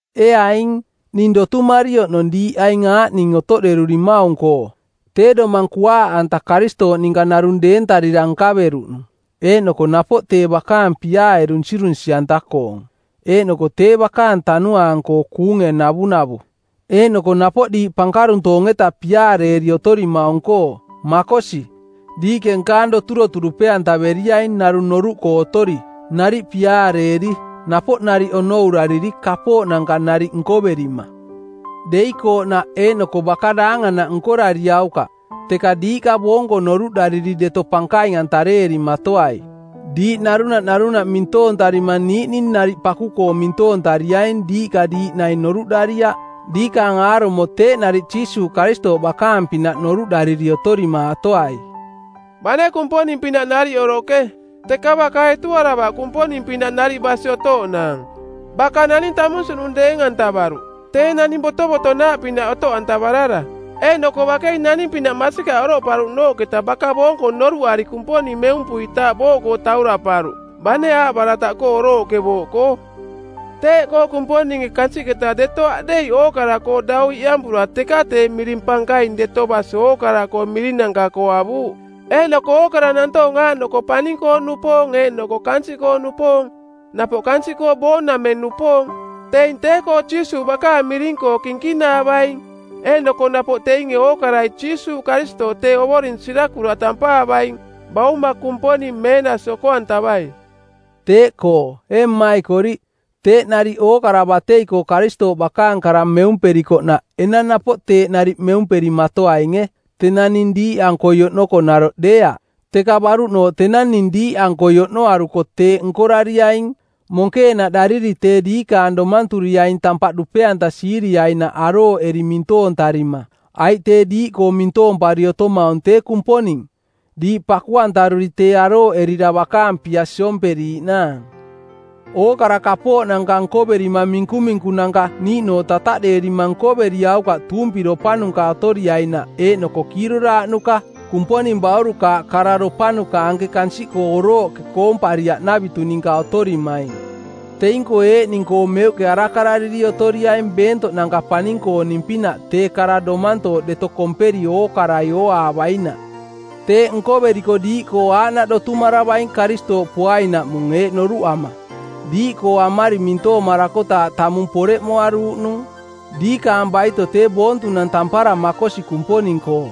Ee aing, ning dotumari oꞌnong diiꞌ aing aaꞌning otoꞌderurimaung-koo: tee domang kuaaꞌanta Karistooꞌ ninka narung deentarira nkaveruꞌnung, eeꞌnoko napoꞌ tee bakaang piaae dunsirunsi˜anta-koong, eeꞌnoko tee bakaang Tanuaang-koo kuunge navunavu, eeꞌnoko napoꞌ diiꞌka pankaruntoong-eta piaareeri otorimaung-koo; makosi, diiꞌke nkaang doturotu dupe-antaveriaing narung noruꞌkoo otori, nariꞌ piaareeri, napoꞌ nariꞌ onourariri kapooꞌnanka nariꞌ nkoverima. Deikooꞌnaꞌ eeꞌnoko baka daanganaꞌ nkorariaukaꞌ, teka diiꞌka boonko noruꞌdariri deto pankaing-antareerimatoai. Diiꞌ narunaꞌ narunaꞌ mintoontarima niiꞌning nariꞌ paku-koo mintoontariaing diiꞌka diiꞌ naing noruꞌdariaꞌ. Diikaang aarumo teeꞌ nariꞌ Jiisuuꞌ Karistooꞌ bakaang-pinaꞌ noruꞌdariri otorimaatoai. Bane Kumponing-pinaꞌ nariꞌ oroꞌke, teka baka etuaravaꞌ Kumponing-pinaꞌ nariꞌ basi otooꞌnaang. Baka naning tamunsiꞌnung deeng-antavaruꞌ, tee naning botovotonaaꞌpinaꞌ otoꞌantavarara. Eeꞌnoko bakei naning-pinaꞌ masikaꞌ oroꞌparuꞌnooꞌketa baka boonko noruꞌari Kumponing meumpuitaaꞌ booꞌkoo tauraꞌparuꞌ, bane aaꞌbarataꞌkoo orooꞌke booꞌkoo. Teeꞌkoo Kumponinge kansiꞌketa deto aꞌdeiꞌ ookara-koo dau iꞌampura teka tee miring pankaing deto basi ookara-koo mirinanka-koo avuuꞌ. Eeꞌnoko ookara nantoong aaꞌnoko paning-koo-nupoong eeꞌnoko kansiꞌkoo-nupoong, napoꞌ kansiꞌkoo boong-nameng-nupoong, teing tee-koo Jiisuuꞌ bakaang miring-koo kinkinaavaing. Eeꞌnoko napoꞌ teinge ookarai Jiisuuꞌ Karistooꞌ tee Ovoring sirakuraꞌ tampaavaing, Bauma Kumponing meenasi oko-antavai. Teeꞌkoo, ee mmaikoriꞌ, teeꞌ nariꞌ ookara batei-koo Karistooꞌ bakaang kara meumperikoꞌnaꞌ enang napoꞌ teeꞌ nariꞌ meumperimaatoainge, tenang ning diiꞌankoi oꞌnoko naroꞌ deeaꞌ, teka baruꞌnooꞌ tenang ning diiꞌankoi oꞌnoaruko teeꞌ nkorariaing, monkeenaꞌdariri tee diikaang domanturiaing tampaꞌ dupe-antasiiriainaꞌ arooꞌeri mintoontarima. Aiꞌ tee diiꞌkoo mintoompari otomaung tee Kumponing, diiꞌ paku-antaruri tee arooꞌerira bakaang pia siomperiiꞌnaang. Ookara kapooꞌnanka nkoverima minkuminkunanka niiꞌnooꞌ tataꞌdeerima nkoveriaukaꞌ tuumpiropanuka otoriainaꞌ eeꞌnoko kiiroraaꞌnuka, Kumponing baurukaaꞌ kararopanuka anke kansiꞌkoo orooꞌke koompariaꞌnavitu ninka otorimaing. Teing-koo eeꞌning-koo meuꞌke arakarariri otoriaing beentoꞌnanka paning-kooning-pinaꞌ tee kara domantooꞌ deto komperi ookarai ooaavainaꞌ. Teeꞌ nkoveriko diiꞌkoo aaꞌnaꞌ dotumaravaing Karistooꞌ poainaꞌmung eeꞌ noruꞌama: diiꞌkoo amari mintoomarakotaaꞌ tamung poreꞌmoaruuꞌnung. Diikaang baito tee boontunang tampara makosi Kumponing-koo,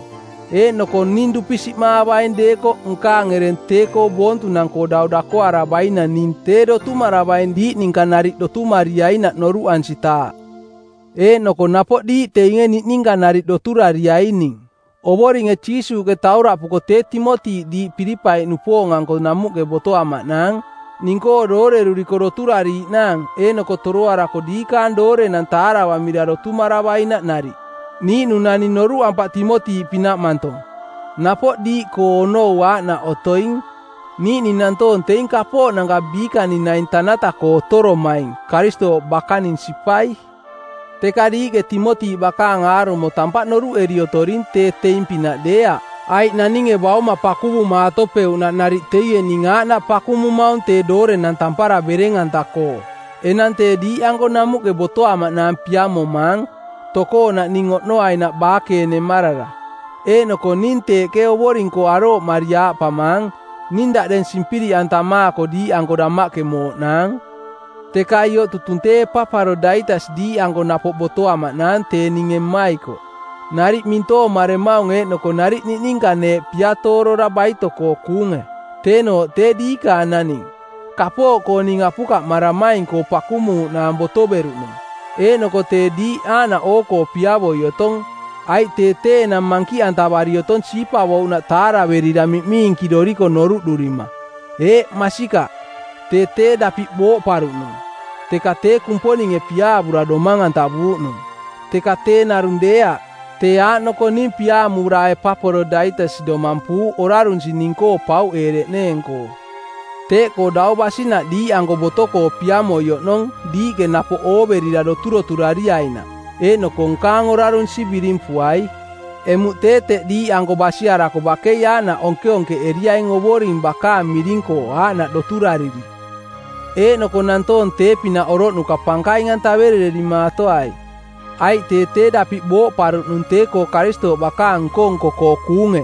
eeꞌnoko ning dupisiꞌmaavaing deekoꞌ nkaang ereng tee-koo boontunang-koo dau dakoaravainang ning tee dotumaravaing diiꞌ ninka nariꞌ dotumariainaꞌ noruꞌansitaaꞌ. Eeꞌnoko napoꞌ diiꞌ teinge niꞌninka nariꞌ doturariaining. Ovoringe Jiisuuꞌke tauraꞌpuko tee Timoti diiꞌ Pilipai-nupoong-anko namuꞌke botoamaꞌnaang, ning-koo dooreruriko doturariiꞌnaang eeꞌnoko toroarako diikaang doorenang taaravamira dotumaravainaꞌ nariꞌ. Niiꞌnung naning noruꞌampaꞌ Timoti-pinaꞌ mantong, napoꞌ diiꞌkoo onou aaꞌnaꞌ otoing. Niiꞌning nantoong teing kapooꞌnanka biikaning naing tanata-koo otoromaing, Karistooꞌ bakaning sipai. Teka diiꞌke Timoti bakaang aarumo tampaꞌ noruꞌeri otoring tee teing pinaꞌ deeaꞌ, aiꞌ naninge bauma pakuvumaatopeuꞌnaꞌ nariꞌ teie ning aaꞌnaꞌ pakumumaung tee doorenang tampaara bereng-anta-koo. Enang tee diiꞌanko namuꞌke botoamaꞌnaang piamomaang, tokoonaꞌ ning oꞌnoainaꞌ baakeenemarara. Eeꞌnoko ning teeꞌke Ovoring-koo arooꞌmari aaꞌpamaang, “Ning daꞌdeng simpiriꞌantamaako diiꞌanko damaꞌke mooꞌnaang.” Teka ioꞌ tutung tee Epaparodaitas diiꞌanko napoꞌ botoamaꞌnaang tee ninge mmaikoꞌ, nariꞌ mintoomaremaung eeꞌnoko nariꞌ niꞌninka neeꞌ piatoorora˜ baito-koo kuunge. Teenooꞌ tee diikaang naning, kapooꞌkoo ning apukaꞌmaramaing-koo pakumuuꞌnaang botoveruꞌnung. Eeꞌnoko tee diiꞌ aaꞌnaꞌ oo-koo piavoi otong. Aiꞌ tee tee enang mankiꞌantavari otong siipavouꞌnaꞌ taaraverira miꞌmiinkiꞌdoriko noruꞌdurima. Eeꞌ, masikaꞌ, tee tee dapiꞌ booꞌparuꞌnung, teka tee Kumponinge piaavura domang-antavuuꞌnung. Teka tee narung deeaꞌ, tee aaꞌnoko ning piaamura Epaparodaitas domampuuꞌ, orarunsi ning-koo pauꞌeereꞌneeng-koo. Teeꞌkoo dau basinaꞌ diiꞌanko boto-koo piamoi oꞌnong diiꞌke napoꞌ ooverira doturoturariainaꞌ, eeꞌnoko nkaang orarunsi birimpuai. Emuꞌ tee teꞌ diiꞌanko basiarako bakei aaꞌnaꞌ onkeonkeꞌeriaing Ovoring bakaang miring-koo aaꞌnaꞌ doturariri. Eeꞌnoko nantoong tee-pinaꞌ oroꞌnuka pankaing-antaverererimaatoai. Aiꞌ tee tee dapiꞌ booꞌparuꞌnung tee-koo Karistooꞌ bakaang-koo nko-nko-koo kuunge;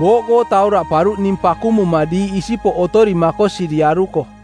booꞌkoo tauraꞌparuꞌ ning pakumuma diiꞌ isipoꞌ otori makosiriaruko.